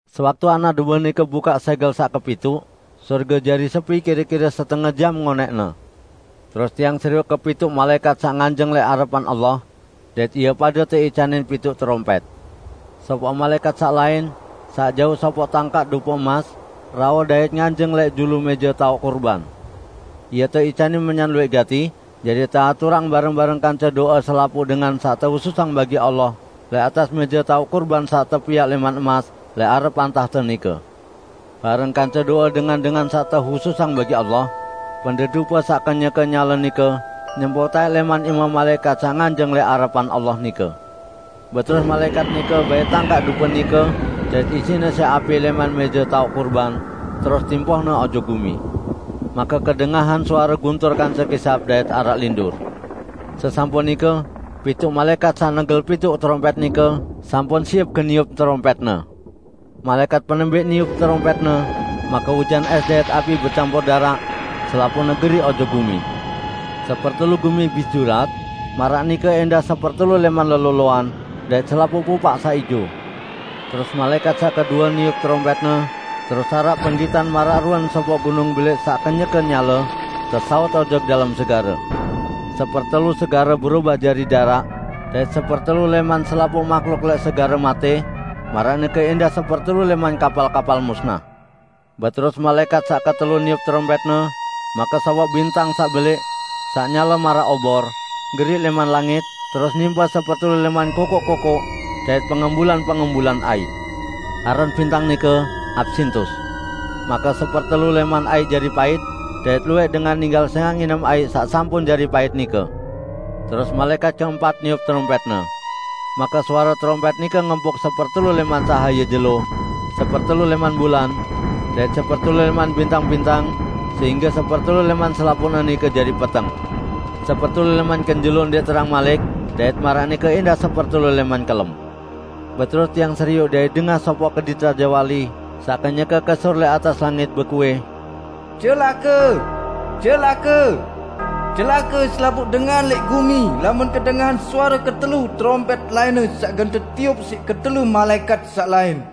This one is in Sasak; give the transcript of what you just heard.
Sewaktu Anak Dombe nike bukaq sẽgel saq kepituq, sorge jari sepi kire-kire setenge jam ngonẽqne. Terus tiang serioq kepituq malaẽkat saq nganjeng lẽq arepan Allah, dait ie pade teicanin pituq terompẽt. Sopoq malaẽkat saq lain, saq jauq sopoq tangkaq dupe emas, rauh dait nganjeng lẽq julu mẽje taoq kurban. Ie teicanin menyan luwẽq gati jari teaturang bareng-bareng kance do'e selapuq dengan saq tehususang bagi Allah lẽq atas mẽje taoq kurban saq tepiaq lẽman emas lẽq arepan tahte nike. Bareng kance do'e dengan-dengan saq tehususang bagi Allah, pendet dupe saq kenyeke nyale nike nyempuq taẽk lẽman ime malaẽkat saq nganjeng lẽq arepan Allah nike. Beterus malaẽkat nike bait tangkaq dupe nike, dait isiqne siq api lẽman mẽje taoq kurban, terus timpohne ojok gumi. Make kedengahan suare guntur kance kisap dait araq lindur. Sesampun nike, pituq malaẽkat saq negel pituq terompẽt nike sampun siep gen niup terompẽtne. Malaẽkat penembẽq niup terompẽtne, make ujan ẽs dait api becampur daraq, selapuqne geriq ojok gumi. Sepertelu gumi bis julat; maraq nike ẽndah sepertelu lẽman leloloan, dait selapuq pupaq saq ijo. Terus malaẽkat saq kedue niup terompẽtne, terus araq penggitan maraq ruen sopoq gunung belẽq saq kenyeke nyale tesaut ojok dalem segare. Sepertelu segare berobah jari daraq, dait sepertelu lẽman selapuq mahluk lẽq segare matẽ; maraq nike ẽndah sepertelu lẽman kapal-kapal musnah. Beterus malaẽkat saq ketelu niup terompẽtne, make sopoq bintang saq belẽq, saq nyale maraq obor, geriq lẽman langit, terus nimpe sepertelu lẽman kokoq-kokoq dait pengembulan-pengembulan aiq. (Aran bintang nike "Apsintus".) Make sepertelu lẽman aiq jari pait, dait luwẽq dengan ninggal sẽngaq nginem aiq saq sampun jari pait nike. Terus malaẽkat keempat niup terompẽtne. Make suare terompẽt nike ngempuk sepertelu lẽman cahaye jelo, sepertelu lẽman bulan, dait sepertelu lẽman bintang-bintang sehingge sepertelu lẽman selapuqne nike jari peteng. Sepertelu lẽman kenjelo ndẽq terang malik dait maraq nike ẽndah sepertelu lẽman kelem. Beterus tiang serioq dait dengah sopoq kedit rajewali saq kenyeke kesur lẽq atas langit, bekuih, "Celake! Celake! Celake selapuq dengan lẽq gumi lamun kedengahan suare ketelu terompẽt lainne saq gen tetiup siq ketelu malaẽkat saq lain!"